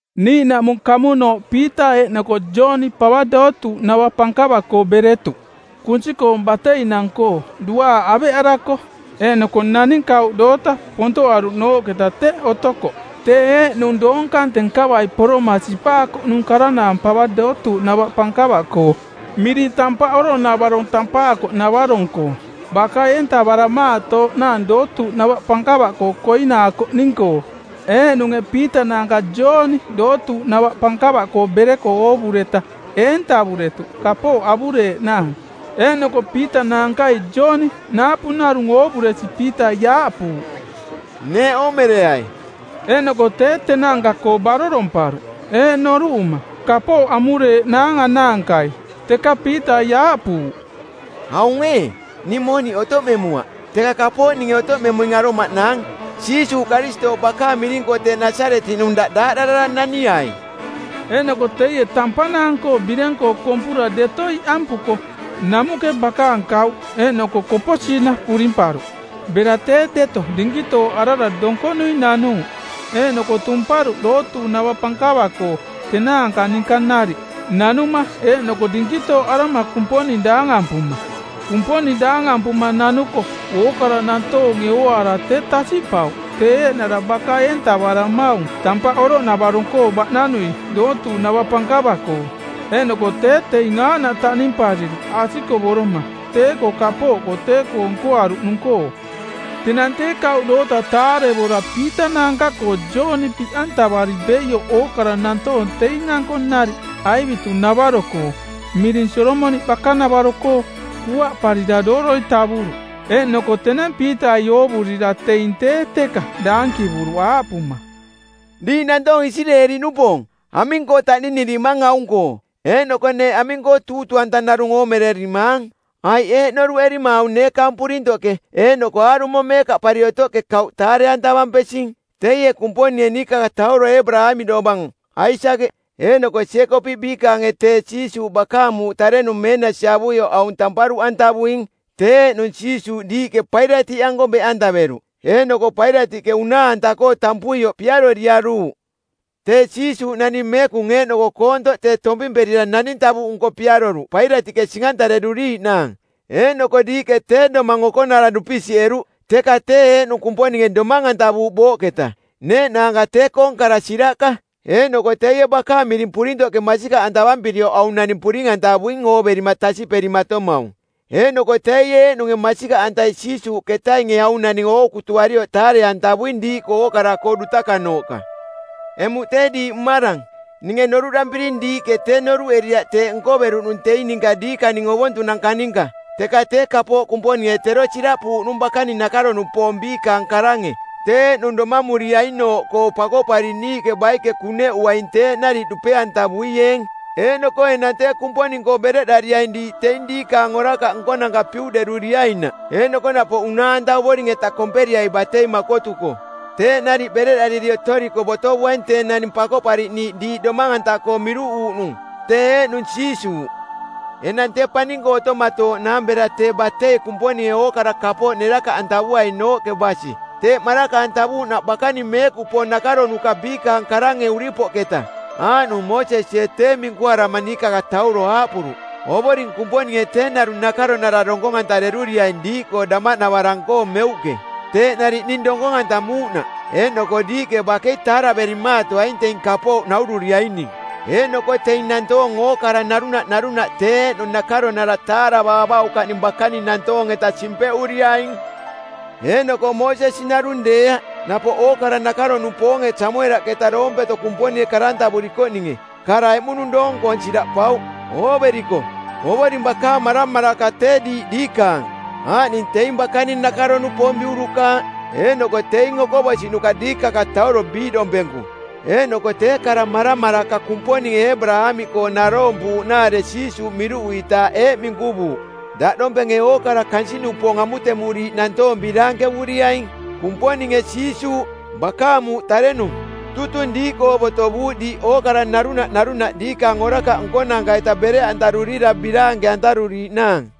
Niiꞌnaꞌmung kamunooꞌ Piita eeꞌnoko Jooni pava dootuuꞌnava pankava-koo beretuꞌ kunsi-koong bateinang-koo, duaaꞌ aveꞌarako. Eeꞌnoko naning kauꞌ doota pontoꞌaruꞌnooꞌketa teꞌ otokoꞌ. Tee eeꞌnung doong kante nkavai poroma sipaakoꞌnung karanaang pava dootuuꞌnava pankava-koo, miring Tampaꞌ Oroꞌnavarong tampaakoꞌnavarong-koo, baka-eentavaramaatooꞌnaang dootuuꞌnava pankava-koo koinaakoꞌning-koo. Eeꞌnunge Piita naanka Jooni dootuuꞌnava pankava-koo bereko oovureta eentavuretuꞌ kapooꞌ avureeꞌnaang. Eeꞌnoko Piita naankai Jooni naapu narung oovuresi Piitai aaꞌpuuꞌ, “Neeꞌ oomereai.” Eeꞌnoko tee tenaanka-koo baroromparuꞌ eeꞌ noruꞌuma: Kapooꞌ amureeꞌnaang anaankai. Teka Piitai aaꞌpuuꞌ, “Aung ee, ning mooniꞌ otoꞌmemuaꞌ, teka kapooꞌ ning otoꞌmemuing aromaꞌnaang. Jiisuuꞌ Karistooꞌ bakaang miring-koo tee Nasaretiꞌnung daꞌ daaꞌdarara naniai!” Eeꞌnoko teie tampanaang-koo bireng-koo kompura deto iꞌampuko namuꞌke bakaang kauꞌ eeꞌnoko koposiina purimparuꞌ. Bera tee deto dinkitooꞌarara donkonui nanuuꞌ eeꞌnoko tumparuꞌ dootuuꞌnava pankava-koo tenaanka ninka nariꞌ, nanuma eeꞌnoko dinkitooꞌarama Kumponing daangampuma. Kumponing daangampuma nanuko ookara nantoonge ooaara tee tasiꞌpauꞌ tee eeꞌnara baka-eentavaramaung Tampaꞌ Oroꞌnavarong-koo baꞌnanui dootuuꞌnava pankava-koo. Eeꞌnoko tee teing aaꞌnaꞌ taꞌnimpariruꞌ asikovoroma tee-koo kapooꞌkoo tee-koo nkoaruꞌnung-koo. Tenang tee kauꞌ doota taarevora Piita naanka-koo Jooni biꞌantavari beioꞌ ookara nantoong teing-anko nariꞌ aivitu-navaro-koo˜ miring Solomoniꞌ bakanavaro-koo kuaꞌparira dooroi tavuruꞌ. Eeꞌnoko tenang Piitai oovurira teing tee teka daankivuruꞌ aaꞌpuma, “Diiꞌ nantoong Isireeli-nupoong, aming-koo taꞌninirimang aung-koo, eeꞌnoko neeꞌ aming-koo tuutuuꞌanta narung oomererimaang? Aiꞌ eeꞌ noruꞌerima aung neekaang purintoꞌke eeꞌnoko aarumo meekaꞌpari otoꞌke kauꞌ taare-antavampesing? Teie Kumponinge niikakatauro Eebaraamiꞌ dovang, Aisakeꞌ, eeꞌnoko Jeekopiꞌ biikaange tee Jiisuuꞌ bakaang muuꞌ tarenung meenasi avuioꞌ aung tamparuꞌantavuing. Tee eeꞌnung Jiisuuꞌ diiꞌke Pailatiꞌanko beꞌantaveruꞌ, eeꞌnoko Pailatiꞌke unaa-anta-koo tampuioꞌ piaroriaruuꞌ. Tee Jiisuuꞌ naning meekung eeꞌnoko koontoꞌ tee tompimperira naning tavuꞌnko piaroruꞌ Pailatiꞌke sing-antareruriiꞌnaang. Eeꞌnoko diiꞌke tee Domaang Okonara dupisiꞌeruꞌ, teka tee eeꞌnung Kumponinge domang-antavuuꞌ booꞌketa. Neeꞌnaanka tee-koong kara siraꞌka. Eeꞌnoko teie bakaang miring purintoꞌke masikaꞌantavampirioꞌ aung naning puring-antavuing ooverima tasiꞌperimatomaung. Eeꞌnoko teie eeꞌnunge masikaꞌantai Jiisuuꞌketainge aung naning ookutuarioꞌ taare-antavuing diiꞌkoo ookara-koo dutakanooꞌka. “Emuꞌ tee diiꞌ mmarang, ninge noruꞌdampiring diiꞌke tee noruꞌeriaꞌ teeꞌ nkoveruꞌnung teing ninka diikaning ovontunanka ninka. Teka tee kapooꞌ Kumponinge tero siraꞌpuuꞌnung bakaning nakaro-nupoong biikaang karange, tee eeꞌnung domamuriainooꞌkoo Pakoꞌpariꞌniiꞌke baike kuneꞌuaing teeꞌ nariꞌ dupe-antavuieeng. Eeꞌnoko enang tee Kumponing-koo bereꞌdariaing diiꞌ teing diikaang orakaꞌ nkonanka piuꞌderuriainaꞌ eeꞌnoko napoꞌ unaa-anta Ovoring-eta komperiai batei makotuko. Teeꞌ nariꞌ bereꞌdariri otoriko botovuaing tee naning Pakoꞌpariꞌniiꞌ diiꞌ domang-anta-koo miruꞌuuꞌnung, tee eeꞌnung Jiisuuꞌ. Enang tee paning-koo otomatooꞌnaang bera tee batei Kumponinge ookara kapooꞌ nerakaꞌantavuainooꞌke basi teeꞌ maraka-antavuuꞌnaꞌ bakaning meekupoong nakaronuka biikaang karange uripoꞌketa. Aaꞌnung Moosesie tee minkuarama niikakatauro aaꞌpuruꞌ, ‘Ovoring Kumponinge tee narung nakaronara donkong-antareruriaing diiꞌkoo damaꞌnavarang-koo meuꞌke, teeꞌ nariꞌ ning donkong-antamuuꞌnaꞌ, eeꞌnoko diiꞌke bakei taaraverimaatoaing teing kapooꞌ naururiaining. Eeꞌnoko teing nantoong ookara narunaꞌ narunaꞌ tee eeꞌnung nakaronara taaravaavaukaꞌning bakaning nantoong-eta simpeꞌuriaing.’ “Eeꞌnoko Moosesi narung deeaꞌ, napoꞌ ookara nakaro-nupoonge Samuelaꞌketa doompeto Kumponinge karantavurikoꞌninge˜ kara eꞌmunung doong-koong siraꞌpauꞌ. Ooveriko, Ovoring bakaang maramaraka tee diiꞌ diikaang, aaꞌning teing bakaning nakaro-nupoong biurukaaꞌ, eeꞌnoko teing okoꞌbosiꞌnuka diikakatauro biiꞌdompenku. Eeꞌnoko tee kara maramaraka Kumponinge Eebaraamiꞌkoo naroompuuꞌnaare Jiisuuꞌ miruꞌuitaaꞌ eeꞌ minkuvuuꞌ, ‘Daꞌdompenge ookara kansiꞌnupoong amutemuriiꞌ nantoong biraankevuriaing.’ Kumponinge Jiisuuꞌ, bakaang muuꞌ tarenung, tutung diiꞌkoo botovuuꞌ diiꞌ ookara narunaꞌ narunaꞌ diikaang orakaꞌ nkonanka-ita bereꞌantarurira biraanke-antaruriiꞌnaang.”